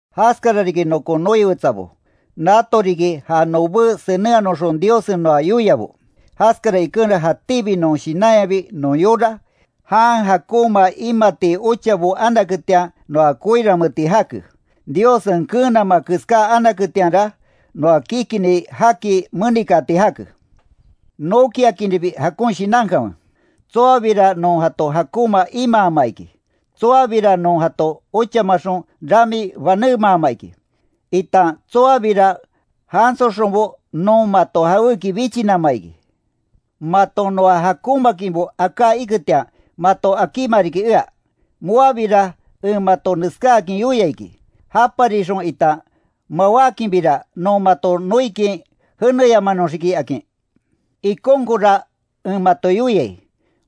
Jaskara riki nokon noi wetsabo, nato riki ja nobé senenhanoxon Diossen noa yoiabo. Jaskara ikenra, jatíbi non shinanyabi non yora, jan jakonma imati ochabo anaketian noa koiranmeeti jake. Diossen keenama keská anaketianra, noa kikinni jaki menikaati jake. Nokiakinribi jakon shinankanwe; tsoabira non jato jakonma imaama iki, tsoabira non jato ochamaxon rami banemaama iki, itan tsoabira jansoxonbo non mato jawéki bichinama iki. Maton noa jakonmaakinbo aká iketian, mato akíma riki ea. Moabira en mato neskáakin yoia iki, japarixon itan mawákinbira, non mato noikin jeneyamanoxiki, akin. Ikonkonra en mato yoiai,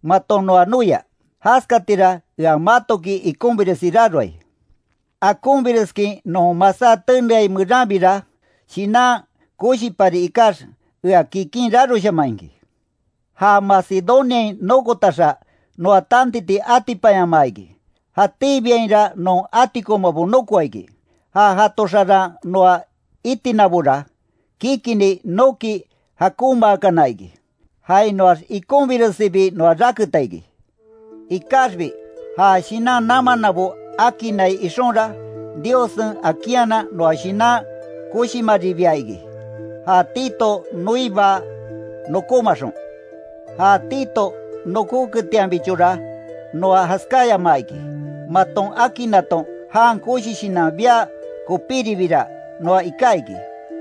maton noa noia, jaskatira ea matoki ikonbiresi raroai. Akonbireskin non masá teneai meranbira, shinan koshipari ikax, ea kikin raroshaman iki. Ja Macedoniain nokotaxa, noa tantiti atipanyamaa iki, jatíbiainra non atikonmabo nokoa iki. Ja jato xaran noa itinabora, kikinni noki jakonmaakana iki, jainoax ikonbiresibi noa raketa iki. Ikaxbi ja shinan namannabo akinnai ixonra, Diossen akinhanan non shinan koshimaribia iki, ja Tito noiba nokómaxon. Ja Tito nokóketianbichora noa jaskáyamaa iki, maton akinnaton jan koshi shinan bia kopíribira, noa iká iki.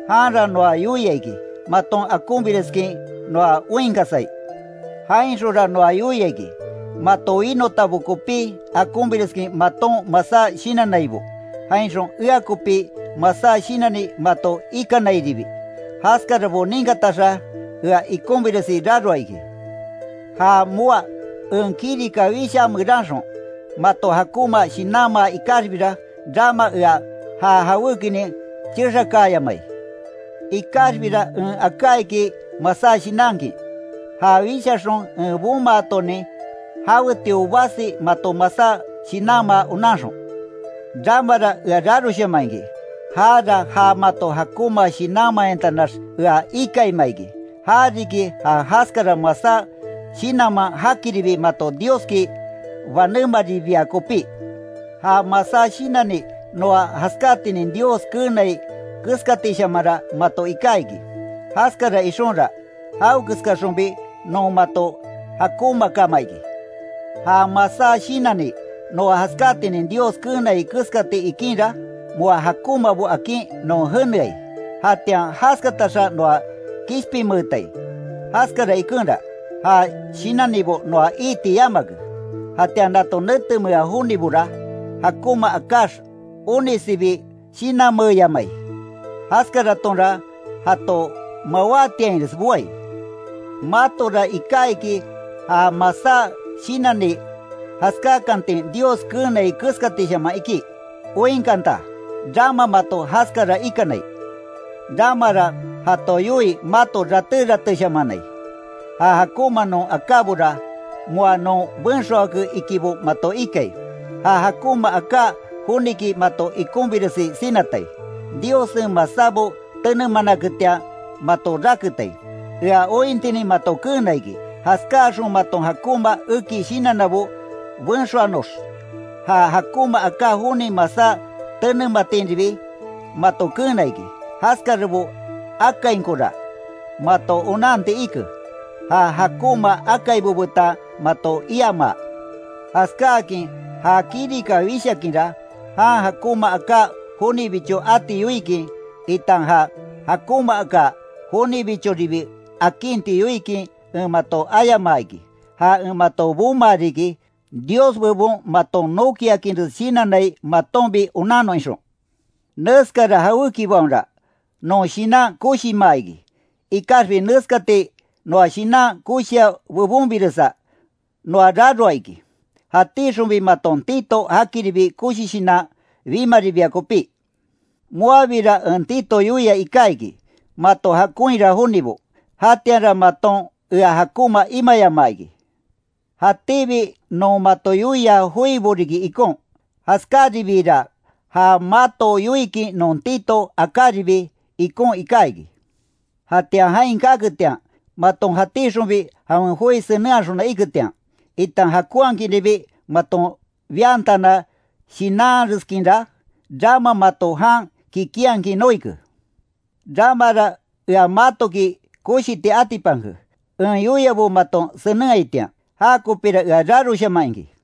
Janra noa yoia iki, maton akonbireskin noa oinkasai. Jainxonra noa yoia iki, mato winotabo kopí, akonbireskin maton masá shinannaibo, jainxon ea kopi masá shinanni mato ikanairibi. Jaskarabo ninkataxa, ea ikonbiresi raroa iki. Ja moá en kirika wishaa meranxon, mato jakonma shinanmaa ikaxbira, rama ea ja jawékinin chexakaayamai. Ikaxbira en aká iki masá shinankin, ja wishaxon en bomaatonin jawetio basi mato masá shinanmaa onanxon. Ramara ea raroshaman iki, jara ja mato jakonma shinanmayantanax ea ikaima iki, ja riki ja jaskara masá shinanman jakiribi mato Dioski banémaribia kopí. Ja masá shinanni noa jaskátinin Dios keenai keskatishamanra mato iká iki, jaskara ixonra, jawekeskaxonbi non mato jakonmaakama iki. Ja masá shinanni noa jaskátinin Dios keenai keskati ikinra, moa jakonmabo akin non jeneai, jatian jaskataxa noa kishpinmeetai. Jaskara ikenra, ja shinannibo noa iiti yamake. Jatian nato netemea jonibora, jakonma akáx, onisibi shinanmeeyamai, jaskaratonra jato mawátiainres boai. Matora iká iki ja masá shinanni jaskákantin Dios keenai keskatishaman iki. ¡Oinkanta, rama mato jaskara ikanai! Ramara jato yoii mato raté ratéshamanai, ja jakonma non akábora, moa non benxoake ikibo mato ikai, ja jakonma aká joniki mato ikonbiresi sinatai, Diossen masábo tenemanaketian mato raketai, ea ointinin mato keena iki, jaskáaxon maton jakonma eki shinannabo benxoanox, ja jakonma aká joni masá tenematinribi mato keena iki. Jaskarabo akainkora, mato onanti ike, ja jakonma akaibo betan mato iamaa. Jaskáakin ja kirika wishakinra, jan jakonma aká jonibicho ati yoikin, itan já jakonmaaka jonibichoribi akinti yoikin en mato ayamaa iki, ja en mato bomaa riki, Dios bebon maton nokiakinres shinannai matonbi onannon ixon. Neskara jawékibaonra, noa shinan koshimaa iki. Ikaxbi neskati noa shinan koshia bebonbiresa, noa raroa iki, jatíxonbi maton Tito jakiribi koshi shinan bimaribia kopí. Moabira en Tito yoia iká iki, mato jakonhira jonibo, jatianra maton ea jakonma imayamaa iki. Jatíbi non mato yoia joibo riki ikon, jaskáribiira, ja mato yoikin non Tito akáribi, ikon iká iki. Jatian jain kaketian, maton jatíxonbi jawen joi senenhaxona iketian, itan jakonhakinribi maton biantana shinanreskinra, rama mato jan kikinhakin noike. Ramara ea matoki koshiti atipanke, en yoiabo maton senenhaitian, jakopira ea raroshaman iki.